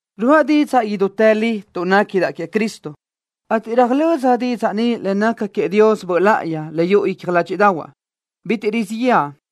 Ruáʼa didzaʼ idútë li tuʼ néquidaʼ queëʼ Cristo, ateʼ röjlö́z didzaʼ ni le naca queëʼ Dios Böʼ Láʼayi le yuʼu icja ládxiʼdaʼahuaʼ. ¡Bitiʼ rizíʼ yëʼa!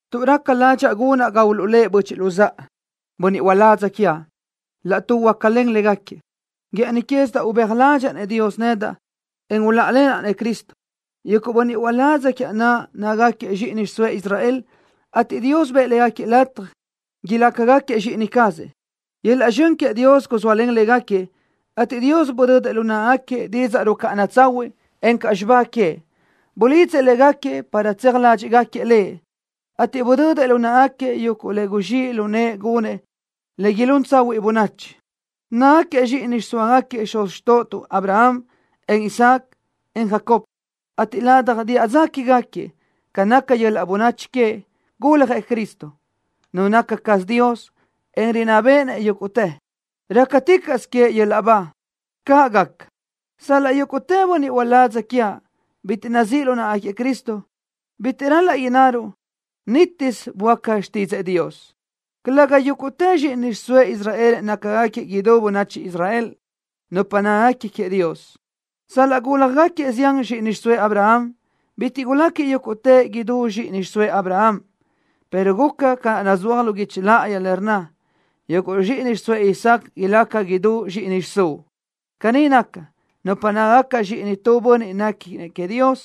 tuʼ raca ládxaʼa gunaʼ ga uluʼlë́ʼ böchiʼ luzáʼa, bönniʼ uládz quiaʼ. Laʼtuʼ huácalen légaquiëʼ, guë́ʼëni quézidaʼ ubéaj ládxëʼë Dios nedaʼ, en uláʼalenaʼ Cristo. Yuguʼ bönniʼ uládz quiaʼ naʼ nácagaquiëʼ zxíʼini xiʼsóëʼ Israel, ateʼ Dios bëʼë légaquiëʼ lataj ilácagaquiëʼ zxíʼini cazëʼ. Yöl-laʼ zxön queëʼ Dios guzóalen légaquiëʼ, ateʼ Dios budödëʼ lu náʼagaquiëʼ didzaʼ rucáʼana tsahuiʼ, encaʼ xibá queëʼ. Bulidzëʼ légaquiëʼ para tseaj ládxiʼgaquiëʼ Lëʼ, ateʼ budödëʼ lu náʼagaquiëʼ yuguʼ le guzxíʼ lu nëʼë gunëʼ le ilún tsahuiʼ bönachi. Nácagaquiëʼ zxíʼini xiʼsóagaquiëʼ xuz xtóʼotuʼ Abraham, en Isaac, en Jacob, ateʼ ladaj diʼa dza quégaquiëʼ, ca naca yöl-laʼ bönachi queëʼ, guljëʼ Cristo, Nu naca caz Dios, en rinná béʼenëʼ yúguʼtë. ¡Rácaticaʼsö queëʼ yöl-laʼ ba! ¡Caʼ gaca! Sal-laʼ yúguʼtë bönniʼ uládz quiaʼ bitiʼ nazíʼ lu náʼagaquiëʼ Cristo, bitiʼ ral-laʼ innaruʼ: Nítisö böáca xtídzëʼë Dios. Calëga yúguʼtë zxíʼini xiʼsóëʼ Israel nácagaquiëʼ idú bönachi Israel, nupa néquiguequi queëʼ Dios. Sal-laʼ gúljagaquiëʼ zián zxíʼini xiʼsóëʼ Abraham, bitiʼ guláquiëʼ yúguʼtëʼ idú zxíʼini xiʼsóëʼ Abraham, pero guca ca naʼ nazúaj lu guichi láʼayi, le rnna: “Yuguʼ zxíʼini xiʼsóëʼ Isaac ilaca idú zxíʼini xiʼsúʼ.” Caní naca, nupa nácagaca zxíʼinëʼ tu bönniʼ néquinëʼ queëʼ Dios,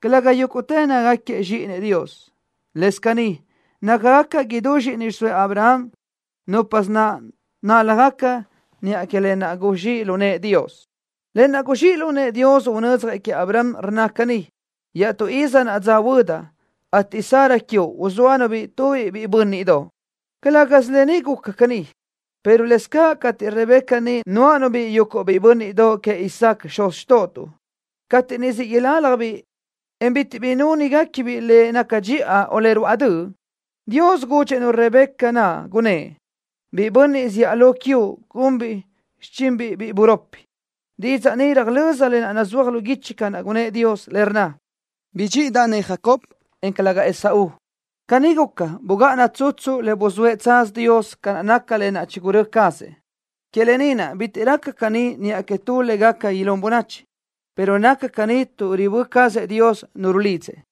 calëga yúguʼtëʼ nácagaquiëʼ zxíʼinëʼ Dios. Lëscaʼ caní, nácagaca idú zxíʼini xiʼsóëʼ Abraham núpasö naʼ náljagaca niʼa que lë naʼ guzxíʼ lu nëʼë Dios. Lë naʼ guzxíʼ lu nëʼë Dios unödzjëʼ queëʼ Abraham rnna caní: “Iaʼtú iz naʼa dza huödaʼ, ateʼ Sara quiuʼ uzóanu-biʼ tubiʼ biʼi bö́nniʼdoʼ.” Calë́gasö lë ni guca caní, pero lëscaʼ cateʼ Rebeca niʼ nuáʼanu-biʼ yuguʼ biʼi bö́nniʼdoʼ queëʼ Isaac, xuz xtóʼotuʼ, cateʼ niʼ siʼ iláljabiʼ, en bitiʼ bi núnigacabiʼ le naca dxiʼa o le ruáʼ döʼ, Dios gudxëʼ-nu Rebeca naʼ, gunnë́ʼ: “Biʼi bönniʼ zíʼalö quiuʼ gunbiʼ xichinbiʼ biʼi buropi.” Didzaʼ ni röjlö́z lë naʼ nazúaj lu guichi ca gunnë́ʼ Dios, le rnna: “Bidxíʼidaʼ-nëʼ Jacob, en calëga Esaú.” Caní guca, bugáʼana tsutsu le buzóëʼ tsaz Dios ca naca lë naʼ chigurö́ cazëʼ. Que lë ni naʼ bitiʼ raca caní niʼa que tu le gaca ilún bönachi, pero naca caní tuʼ ribö́ cazëʼ Dios nu rulidzëʼ.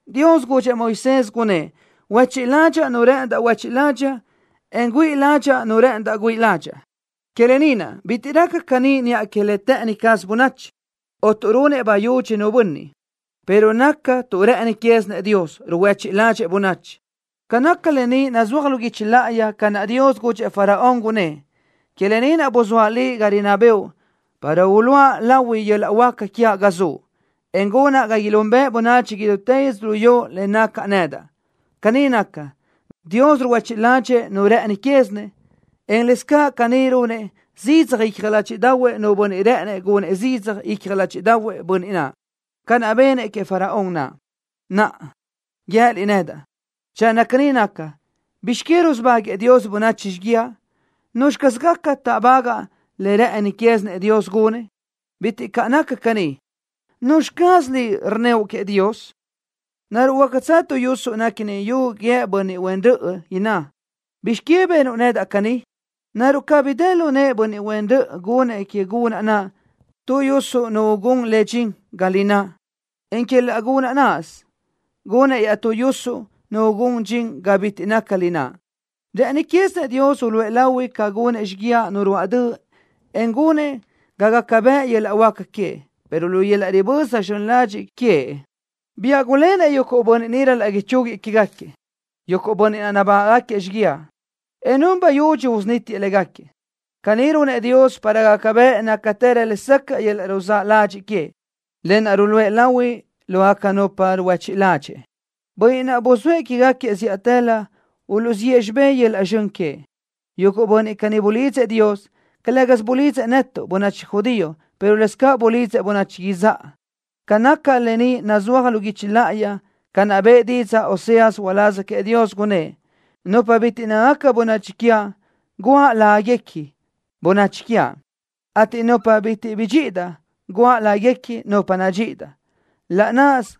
Dios gudxëʼ Moisés, gunnë́ʼ: “Huéchiʼ ládxaʼa nu rë́ʼëndaʼ huéchiʼ ládxaʼa, en güíʼi ládxaʼa nu rë́ʼëndaʼ güíʼi ládxaʼa.” Que lë ni naʼ, bitiʼ raca caní niʼa que le të́ʼëni caz bönachi, o tuʼ runëʼ bayudxi nu bönniʼ, pero naca tuʼ rë́ʼëni quézinëʼ Dios, ruhuéchiʼ ládxëʼë bönachi. Ca naca lë ni nazúaj lu guichi láʼayi ca naʼ Dios gudxëʼ Faraón, gunnë́ʼ: “Que lë ni naʼ buzóaʼ liʼ ga rinná bëʼu para uluʼa lahui yöl-laʼ huáca quiaʼ ga zuʼ, en gunaʼ ga ilunbëʼ bönachi idútë yödzölió le nacaʼ nedaʼ.” Caní naca, Dios ruhuéchiʼ ládxëʼë nu rë́ʼëni quézinëʼ, en lëscaʼ caní runëʼ zidzaj icja ládxiʼdaʼahuëʼ nu bönniʼ rë́ʼënëʼ gunëʼ zidzaj icja ládxiʼdaʼahuëʼ bönniʼ naʼ, ca naʼ benëʼ queëʼ Faraón naʼ. Naʼa guië́liʼ nedaʼ: “Channö caní naca, ¿bizx que rusubáguëʼë Dios bönachi xíguiaʼ? ¿Nuzxi caz gaca táʼbagaʼ le rë́ʼëni quézinëʼ Dios gunëʼ?” ¡Bitiʼ caʼ naca caní! ¿Nuzxi caz liʼ rnníoʼ que Dios? ¿Naruʼ huácatsö tu yusuʼ néquini yu guíë bönniʼ huen röʼö, inná: “¿Bizx que benuʼ nedaʼ caní?” ¿Naruʼ cabí dë lu nëʼë bönniʼ huen röʼö gunëʼ que gunaʼ naʼ tu yusuʼ nu ugún le dxin ga lináʼ, en que laʼ gunaʼ náʼasö gunëʼ iaʼtú yusuʼ nu ugún le dxin ga bitiʼ naca lináʼ? Rë́ʼëni quézinëʼ Dios uluʼë lahui ca gunëʼ xíguiaʼ nu ruáʼ döʼ en gunëʼ ga gaca bëʼ yöl-laʼ huáca queëʼ, pero lu yöl-laʼ riböza zxön ladxiʼ queëʼ biáʼ gulénëʼ yuguʼ bönniʼ niʼ ral-laʼ ichúguiëʼ quégaquiëʼ, yuguʼ bönniʼ naʼ nabágaʼgaquiëʼ xíguiaʼ, en run bayudxi usunítiëʼ légaquiëʼ. Caní runëʼ Dios para gaca bëʼ nácatërö lesacaʼ yöl-laʼ ruzáʼ ladxiʼ queëʼ, lë naʼ ruluʼë lahui lógaca nupa naʼ ruhuéchiʼ ládxëʼë, bönniʼ naʼ buzóëʼ quégaquiëʼ zíʼatëlö uluʼziʼë xibé yöl-laʼ zxön queëʼ. Yuguʼ bönniʼ caní bulidzëʼ Dios. Calë́gasö bulidzëʼ netuʼ, bönachi judío, pero lëscaʼ bulidzëʼ bönachi izáʼa. Ca naca lë ni nazúaj lu guichi láʼayi ca naʼ bëʼë didzaʼ Oseas uláz queëʼ Dios, gunnë́ʼ: Nupa bitiʼ nácagaca bönachi quiaʼ, guʼa láguequi: Bönachi quiaʼ, ateʼ nupa naʼ bitiʼ bidxíʼidaʼ, guʼa láguequi: Nupa nadxíʼidaʼ. Laʼ náʼasö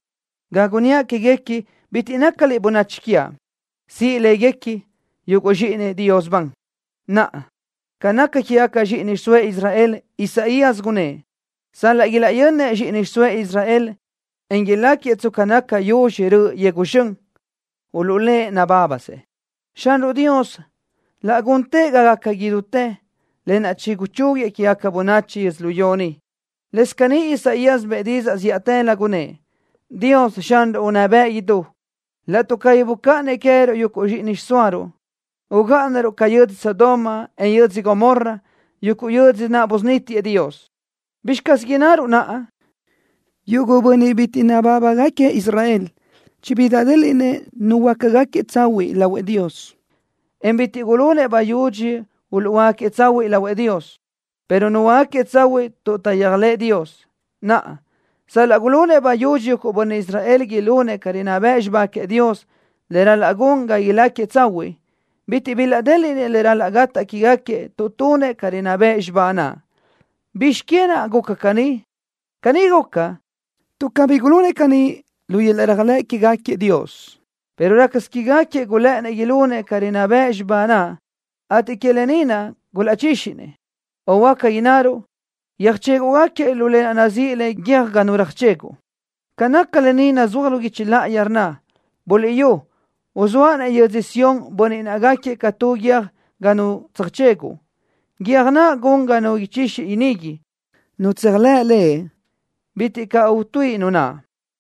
ga gunníaʼ quéguequi: “Bitiʼ nácaliʼ bönachi quiaʼ”, siʼ láguequi: “Yuguʼ zxíʼinëʼ Dios ban.” Naʼa, ca naca quégaca zxíʼini xiʼsóëʼ Israel, Isaías gunnë́ʼ: Sal-laʼ ilaʼyanëʼ zxíʼini xiʼsóëʼ Israel, en iláquiëʼ tsca naca yuzxi tu raʼ yegu zxön, uluʼlë́ʼ nabábasëʼ. Xanruʼ Dios laʼ guntëʼ ga gaca idútë lë naʼ ichúguiëʼ quégaca bönachi yödzölió ni. Lëscaʼ caní Isaías bëʼë didzaʼ zíʼatëlö, gunnë́ʼ: Dios, Xanruʼ unná bëʼ idú, laʼtuʼ cabí bucáʼanëʼ queë́ruʼ yuguʼ zxíʼini xiʼsóaruʼ, ugáʼanaruʼ ca yödzö Sodoma, en yödzö Gomorra, yuguʼ yödzö naʼ busunítiëʼ Dios. ¿Bizxi caz innaruʼ naʼa? Yuguʼ bönniʼ bitiʼ nabábagaquiëʼ Israel chibilaʼdéliʼnëʼ nuhuöácagaquiëʼ tsahuiʼ lahuëʼ Dios, en bitiʼ gulunëʼ bayudxi uluʼhuöáquiëʼ tsahuiʼ lahuëʼ Dios, pero nuhuöácagaquiëʼ tsahuiʼ tuʼ taʼyéajlëʼë Dios. Naʼa, sal-laʼ gulunëʼ bayudxi yuguʼ bönniʼ Israel ilunëʼ ca rinná bëʼ xibá queëʼ Dios, le ral-laʼ gun ga ilácagaquiëʼ tsahuiʼ, bitiʼ bilaʼdéliʼnëʼ le ral-laʼ gataʼ quégaquiëʼ tuʼ tunëʼ ca rinná bëʼ xibá naʼ. ¿Bizx que naʼ guca caní? Caní guca, tuʼ cabí gulunëʼ caní lu yöl-laʼ réajlëʼ quégaquiëʼ Dios, pero rácasö quégaquiëʼ gulë́ʼënnëʼ ilunëʼ ca rinná bëʼ xibá naʼ, ateʼ que lë ni naʼ gulaʼchíxinëʼ, o huáca innaruʼ: Yöjchéguʼgaquiëʼ lu lë naʼ nazíʼi le: Guiö́j Ga Nu Röjcheguʼ. Ca naca lë ni nazúaj lu guichi láʼayi, rnna: ¡Buliʼyú! Uzóaʼ-nëʼ yödzö Sión bönniʼ naʼ gáquiëʼ ca tu guiö́j ga nu tsöjcheguʼ, guiö́j naʼ gun ga nu ichixi inigui. Nu tséajlëʼ Lëʼ, bitiʼ caʼ utuíʼi nu naʼ.